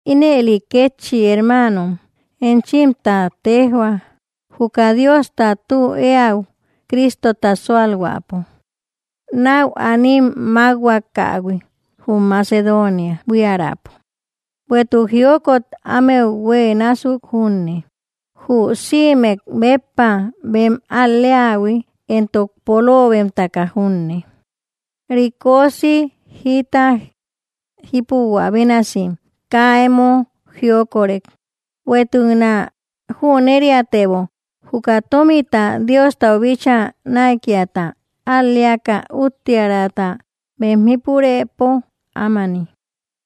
Ínëli kétchi hermanom, enchimtä tejhua juka Diosta tu eäu Cristota sualhuäpo nau anim makhuakahui jum Macedonia buiärapo. Bueïtuk jiokot ámeu huë násuk junne, jü sïmek béppa bem al‑leahui entok polobemtaka junne, rikosi jita jipuhuä bénasim kaa emo jiokorek. Bueïtuknä jüneriatebo, juka tomita Diostau bíchaa naïkiata al‑leaka úttiärata bem jípurëpo ámani,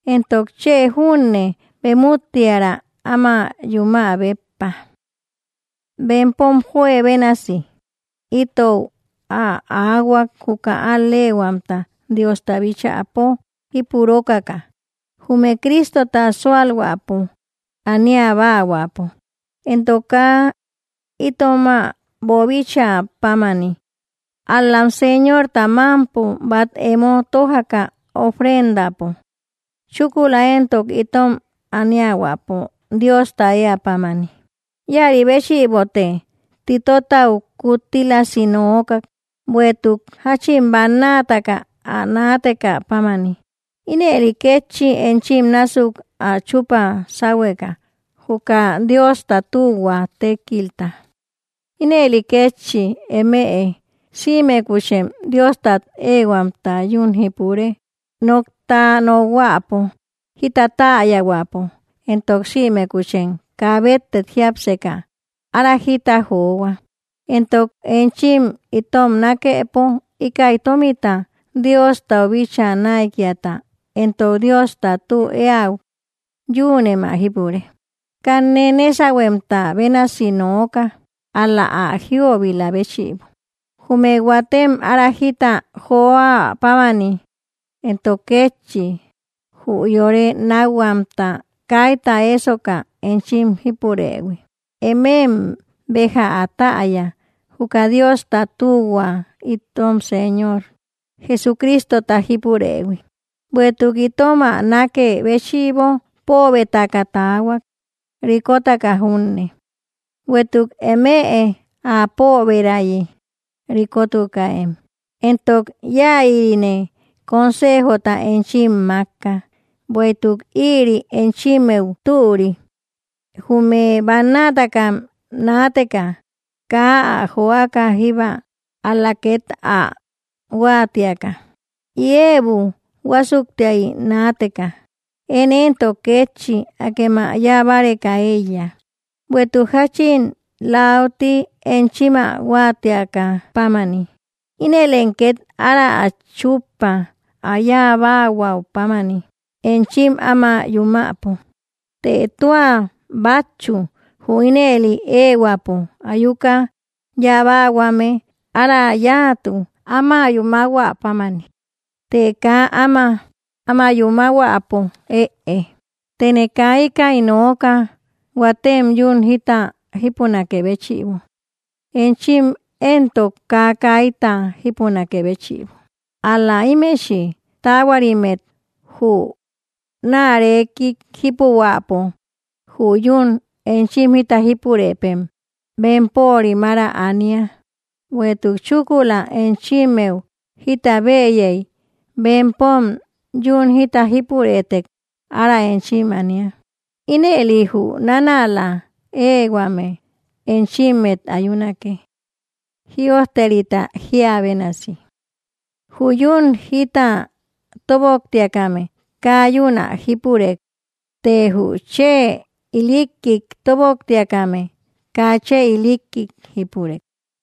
entok chë junne bem úttiära áma yumä béppa. Bempom juebénasi itou ä aahuak juka al‑lehuamta Diosta bíchäpo jipurokaka, jume Cristota sualhuäpo aniabaahuäpo. Entok kaa itomä boobichä pámani, ál-lam Señorta mampo bat emo tojaka ofrendapo, chúkula entok itom aniahuäpo Diosta ëa pámani. Ïari béchïbote Titotau kuttílasi nookak, bueïtuk jachin bannataka ä naatekä pámani, ínëli kétchi enchim násuk ä chupa sahueka, juka Diosta tühua tékilta. Ínëli kétchi, emëe sïmekuchem Diostat ehuamta yún jípure, nokta nokhuäpo, jita täyahuäpo, entok sïmekuchem kaa bettek jiapseka ára jita johua, entok enchim itom nakepo, íkäi tomita Diostau bíchaa naïkiata entok Diosta tü eäu yünem ä jípure. Kanne nesahuemta bénasi nooka, ál‑la ä jïobila béchïbo, jume huatem ára jita joäpámani, entok kétchi jü yore nakhuamta kayta esoka enchim jípurëhui. Emem béja ä täya, juka Diosta tühua itom Señor Jesucristota jípurëhui, bueïtuk itom ä nakë béchïbo poobetaka taahuak, rikotaka junne, bueïtuk emëe ä pooberayi rikotukäem. Entok iayïrine consejota enchim makka, bueïtuk ïri enchimmeu türi, jume bannataka naateka, kaa ä joaka jíbba, ál‑la ket ä huatiaka, ïebu huasuktiay naateka. Én entok kétchi akem ä yáa báreka eíya, bueïtuk jachin lauti enchim ä huatiakä pámani, ínëlem ket ára ä chuppa ä yáabahuä pámani enchim áma yumäpo. Të tua batchu jü ínel ehuäpo ayuka yabahuame, ára yáatu áma yúmahuä pámani, të kaa áma yúmahuäpo ëe. Tëne kaa íkäi nooka, huatem yún jita jipunakë béchïbo, enchim entok kaa kayta jípunakë béchïbo. Ál‑la imechï taahuarimmet jü naarekik jípubahuäpo, jü yún enchim jita jipurëpem bempörim ára ania, bueïtuk chúkula enchimmeu jita bëyei bempom yún jita jípurëtek ára enchim ania, ínëli jü nanäla ehuame enchimmet ayunake. Jïojterita jia bénasi: “Jü yún jita toboktiakame, kaa yún ä jipurek, të jü chë ilikkik toboktiakame, kaa chë ilikik jípurek.”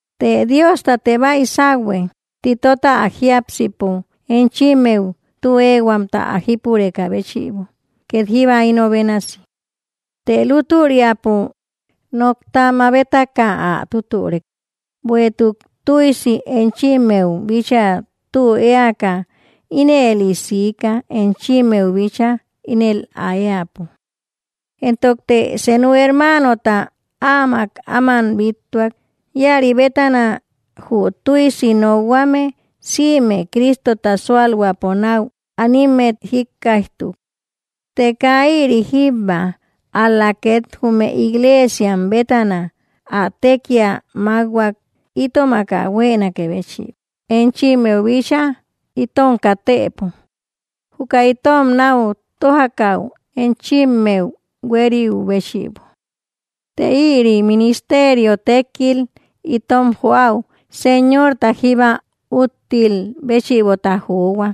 Të Diostate baïsahue Titota ä jiápsipo enchimmeu tü ehuamta ä jípurekä béchïbo ket jíba ino bénasi. Të lútüriapo nokta mabetak ä tutürek, bueïtuk tuïsi enchimmeu bíchaa tü eäka, ínëli siika enchimmeu bíchaa ínel ä eäpo. Entokte senu hermanota áamak áman bíttuak, ïari bétana jü tuïsi nokhuame sïme Cristota sualhuäpo nau animmet jikkaijtu. Të kaa ïri jíbba, ál‑la ket jume iglesiam bétana ä tekia makhuak itomak ä huenakë béchïbo enchimmeu bíchaa itom katëpo, juka itom nau tojakäu enchimmeu hueriu béchïbo; të ïri ministerio tekil itom joäu Señorta jíba úttil béchïbota johua,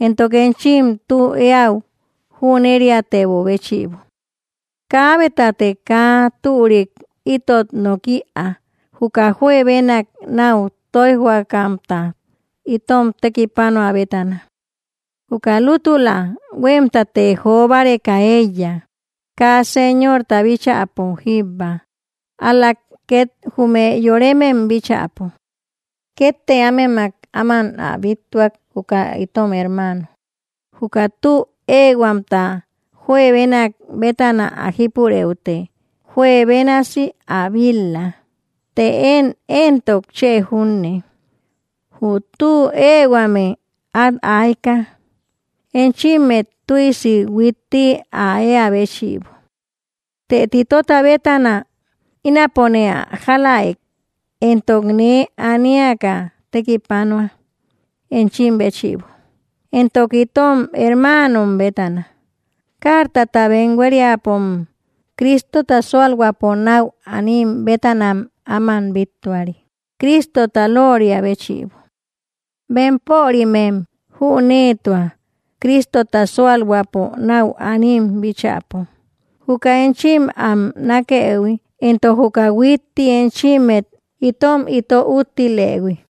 entok enchim tü eäu jüneriatebö béchïbo. Kaabetate kaa türik itot nok‑ïa, juka juebenak nau toïjhuakamtat itom tekipanuä bétana. Juka lútula huemtate jobareka eíya, kaa Señorta bíchäpo jíbba, ál‑la ket jume yoremem bíchäpo. Kette ámemak áman ä bíttuak juka itom hermano, juka tü ehuamta juebenak bétana ä jípureüte juebénasi ä bil‑la, të én entok chë junne, jü tü ehuame at aika, enchimmet tuïsi huitti ä eä béchïbo. Të Titota bétana, ínapone ä jalaëk entok nee aniaka tekipanua enchim béchïbo, entok itom hermanom bétana, cartata bem hueriäpom Cristota sualhuäpo nau anim bétanam aman bittuari Cristota looria béchïbo. Bempörimem jünetua, Cristota sualhuäpo nau anim bíchäpo, juka enchim am nakëhui entok juka huitti enchimmet itom ito úttilëhui.